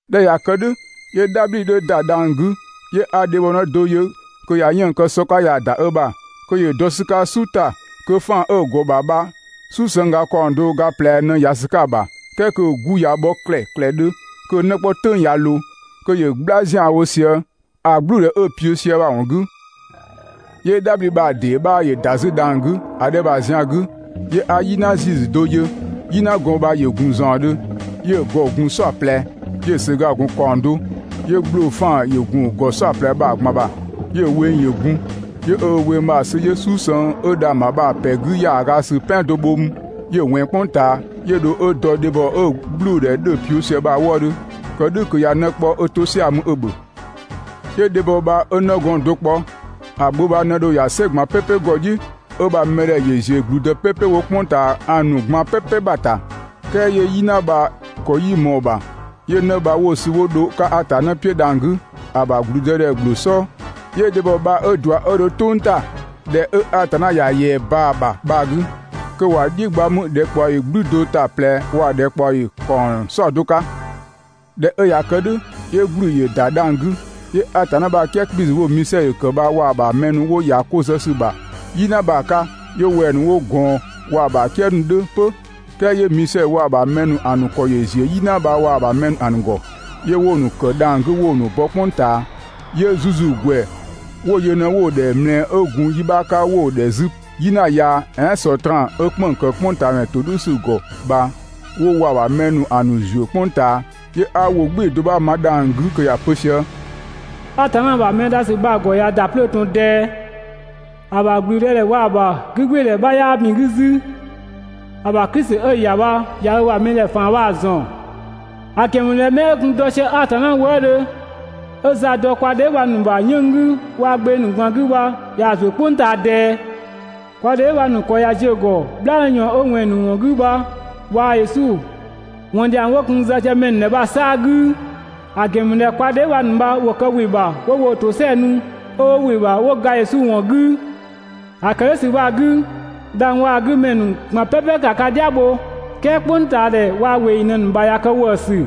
꞊Dhɛ 'ö ꞊ya kë "dhʋ̈, 'yö "dhabhli 'dhö ‑da dhang‑ 'gü, 'yö 'a dhebhɔnë do yö kö ꞊ya 'yënng‑ kë sɔ 'ka ꞊yaa‑ ‑da ö ‑bha, kö ‑yö dɔ ‑sü 'ka "su ‑ta, kö 'faan‑ 'ö‑ ‑gɔ ‑bha bha "susëngga ‑kaɔng do ga ꞊plɛ ꞊në ‑ya ‑sü 'ka‑ ‑bha. "Kɛɛ kö‑ 'gu ‑ya bhɔ ‑klɛklɛdhö, kö‑ 'në 'kpɔ "tʋ̈ng ꞊ya ꞊loo, kö ‑yö "gbla ‑zianwo sië‑ "gblʋ̈ʋ̈dhɛ 'ö‑ piʋ̈ sië bha‑ ‑wɔn 'gü. 'Yö "dhabhli bha‑ ‑dee 'bha ‑yö ‑da 'zü dhang‑ 'gü ‑a 'dhɛ bha‑ zian 'gü. 'Yö 'a "yina ‑ziisü do yö, "yinagɔn bha ‑yö ‑gun ‑zaɔndhö, 'yö‑ ‑gɔ gun "saɔplɛ, 'yö‑ ‑söga gun ‑kaɔng do, 'yö ‑gbloo 'faan‑ ‑yö gun‑ ‑gɔ "saɔplɛ bha‑ ꞊gban ‑bha. 'Yö‑ weng ‑yö gun. 'Yö ö weng bha‑ sü, 'yö "susëng 'ö dhang‑ ‑bha bha‑ ‑pɛ 'gü ‑yaaga ‑sü "pɛan do bho 'mü 'yö‑ ꞊wɛnng "kpʋng ꞊taa, 'yö dho 'ö dɔ dhebhɔ 'ö‑ "gblʋ̈ʋ̈dhɛ 'dhö‑ kë sië bha‑ wëëdhö, kë "dhʋ̈ kö ꞊ya 'në 'kpɔ kö 'ö 'to "sia‑ mü 'ö‑ ‑bhö. 'Yö dhebhɔ bha 'ö 'nëglɔɔn do kpɔ, ‑a gbö bha ꞊në dho ‑ya "sɛ ꞊gban "pɛpɛ ‑gɔ "dhiʋ̈, 'ö‑ ‑bha mɛdhɛ ‑yö ‑ziö ‑gblüdë "pɛpɛ 'wo "kpʋng ꞊taa ‑a ꞊gban "pɛpɛ ‑bha ‑ta, "kɛɛ 'yö "yina gɔn bha‑ ‑kɔ 'yii ꞊mɔɔ‑ ‑bha. 'Yö 'në bha 'wo‑ sü 'wo dho‑ 'ka Atanna "piʋ̈ dhang‑ 'gü, ‑a ‑bha ‑blüdëdhɛ ‑gbloo "sɔɔ. 'Yö dhebhɔ bha 'ö ꞊dua 'yö dho "tʋng ‑ta, ‑dhɛ 'ö Atanna ‑ya ‑yɛa ꞊baa‑ ‑bha bha‑ 'gü, kö ‑wa "dhiʋ̈ gba mü ‑dhɛkpaɔyi "gblü do ‑ta ꞊plɛ waa‑ ‑dhɛkpaɔyi ‑kaɔng "saɔdo 'ka. ꞊Dhɛ 'ö ꞊ya kë "dhʋ̈, 'yö ‑gblü ‑yö ‑da dhang‑ 'gü. 'Yö Atanna ‑bha "kië 'kpiisü 'wo‑ Misɛdhö kë bha waa‑ ‑bha ‑mɛ ‑nu 'wo ‑ya 'ko zë ‑sü ‑bha "yina bha‑ 'ka 'yö wɛng‑ ‑nu 'wo ꞊gɔɔn waa‑ ‑bha "kië ‑nu 'dhö 'pö. "Kɛɛ 'yö Misɛdhö waa‑ ‑bha ‑mɛ ‑nu ‑a ‑nu ‑kɔ ‑yö ‑ziö "yina bha waa‑ ‑bha ‑mɛ ‑nu ‑a ‑nu ‑gɔ, 'yö 'wo‑ ‑nu ‑kë dhang‑ 'gü 'wo‑ ‑nu bɔ "kpʋng ꞊taa. 'Yö ‑zuzugwɛ 'wo yö ꞊në‑ ‑dhɛ ꞊mlɛɛ 'ö gun yi 'bha 'ka, 'wo‑ ‑dhɛ 'zü "yina yaa, "ɛɛn Sɔtraan, 'ö "kpënng‑ ‑kë "kpʋngtaadhɛ ‑todhʋ̈sü ‑gɔ bha 'wo waa‑ ‑bha ‑mɛ ‑nu ‑a ‑nu ‑zuö "kpʋng ꞊taa. 'Yö 'a ‑wʋ "gbɩɩ‑ do 'bha ma dhang‑ 'gü kö ‑ya pö sië: «Atanna ‑bha mɛ dha ‑sü bha‑ ‑gɔ ꞊ya ‑da 'plöö ꞊tɔn ꞊dɛɛ! ‑A ‑bha ‑gblüdëdhɛ waa‑ ‑bha 'gügbɩɩdhɛ 'bha 'yaa ‑bin 'gü 'zü! ‑A ‑bha Klisi 'ö‑ ‑ya bha ꞊ya 'ö ‑bha mɛdhɛ ‑faan bha‑ ‑zɔn! ‑A ‑gɛn ‑mü ꞊dhɛ 'mɛ 'ö gun dɔ sië Atanna wëëdhö 'ö ‑za dɔ kwa dheebhang ‑nu ‑bha 'yënng‑ 'gü waa‑ gbeng ‑nu ꞊gban 'gü bha ꞊yaa‑ ‑zuö "kpʋng ꞊taa ꞊dɛɛ. Kwa dheebhang ‑nu ‑kɔ ꞊ya ziö ‑gɔ "bhlaanë ꞊yɔɔn 'ö ꞊wɛnng ‑nu ‑wɔn 'gü bha waa‑ Yesu ‑wɔn ‑dhiang 'wo gun‑ zë sië mɛ ‑nu ‑dhɛ bha‑ 'saa‑ 'gü. ‑A ‑gɛn ‑mü ꞊dhɛ kwa dheebhang ‑nu bha ‑wo kë ‑we ‑bha 'wo woo‑ tosɛa nu, 'ö 'wo ‑we ‑bha 'wo ga Yesu ‑wɔn 'gü. ‑A ‑kë "dhʋ̈ ‑sü bha‑ 'gü, dhang‑ waa‑ 'gü ‑mɛ ‑nu ꞊gban "pɛpɛ ‑ka ka "dhia bho, "kɛɛ "kpʋngtaadhɛ waa‑ ꞊weeyi ‑nu ꞊në ka ‑bha ꞊ya kë ‑wëësü.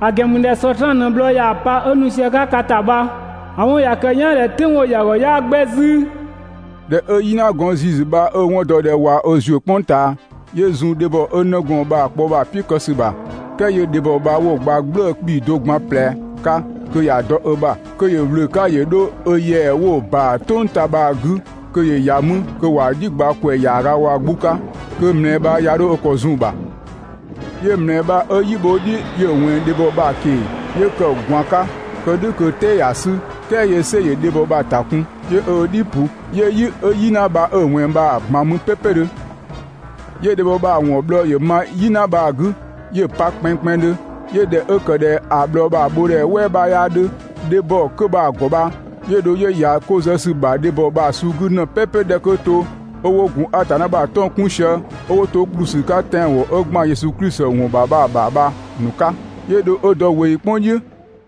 ‑A ‑gɛn ‑mü ꞊dhɛ Sɔtraan ꞊në bhlɔɔ ꞊yaa‑ pa 'ö nu sië‑ 'ka ka ‑ta bha, ‑a 'wɔn ꞊ya kë‑ "yaan ꞊dhɛ "tʋ̈ng 'wo‑ ‑ya ‑gɔ 'yaa 'gbɛ 'zü.» ꞊Dhɛ 'ö "yinagɔn ‑ziisü bha 'ö‑ 'wɔn dɔ ꞊dhɛ ꞊wa ö ‑zuö "kpʋng ꞊taa, 'yö zun dhebhɔ 'ö 'nëgɔɔn bha‑ kpɔ bha‑ "piʋ̈ kë ‑sü ‑bha. "Kɛɛ 'yö dhebhɔ bha 'wo‑ gba "gblëë‑ 'kpii‑ do gban ꞊plɛ 'ka kö ‑ya dɔ ö ‑bha, kö ‑yö ‑wlö 'ka ‑yö 'dho ö ‑yɛa 'wo‑ ꞊baa "tʋng ‑ta bha‑ 'gü kö ‑yö ‑ya mü kö ‑wa "dhiʋ̈ gba ‑kwɛ ‑yaaga waa‑ 'gbu 'ka, kö ꞊mlɛɛ bha 'ya 'dho ö ‑kɔ zun‑ ‑bha. 'Yö ꞊mlɛɛ bha 'ö "yi bho ö "dhi 'yö‑ ꞊wɛnng dhebhɔ bha‑ ꞊keng‑, 'yö ‑kë ꞊gwaan 'ka, kë "dhʋ̈ kö‑ "tɛɛ ‑ya 'sü, "kɛɛ 'yö "sɛ ‑yö dhebhɔ bha‑ ‑ta kun, 'yö ö "dhi ‑pʋ, 'yö "yi 'ö "yina bha 'ö‑ ꞊wɛnng bha‑ ꞊gban mü "pɛɛpɛdhö. 'Yö dhebhɔ bha‑ ‑wɔn bhlɔɔ ‑yö ma "yina bha‑ 'gü 'yö‑ pa kpɛnngkpɛnngdhö, 'yö ꞊dhɛ 'ö ‑kë ꞊dhɛ ‑a bhlɔɔ bha‑ bho ‑dhɛ "wɛɛ 'bhaa 'dhö dhebhɔ 'kö bha‑ ‑gɔ bha, 'yö dho 'yö ‑ya 'ko zë ‑sü ‑bha dhebhɔ bha‑ suu 'gü ꞊në "pɛpɛ 'dhɛ 'kö to, 'ö 'wo gun Atanna ‑bha 'tɔng‑ 'kun sië, 'ö 'wo to ‑kplü ‑sü 'ka tɛanwɔn 'ö ‑gban Yesu Klisi ‑wɔn ‑bha bha‑ ‑bha bha‑ ‑nu 'ka. 'Yö dho 'ö dɔ ꞊weeyi "kpʋng "dhiʋ̈.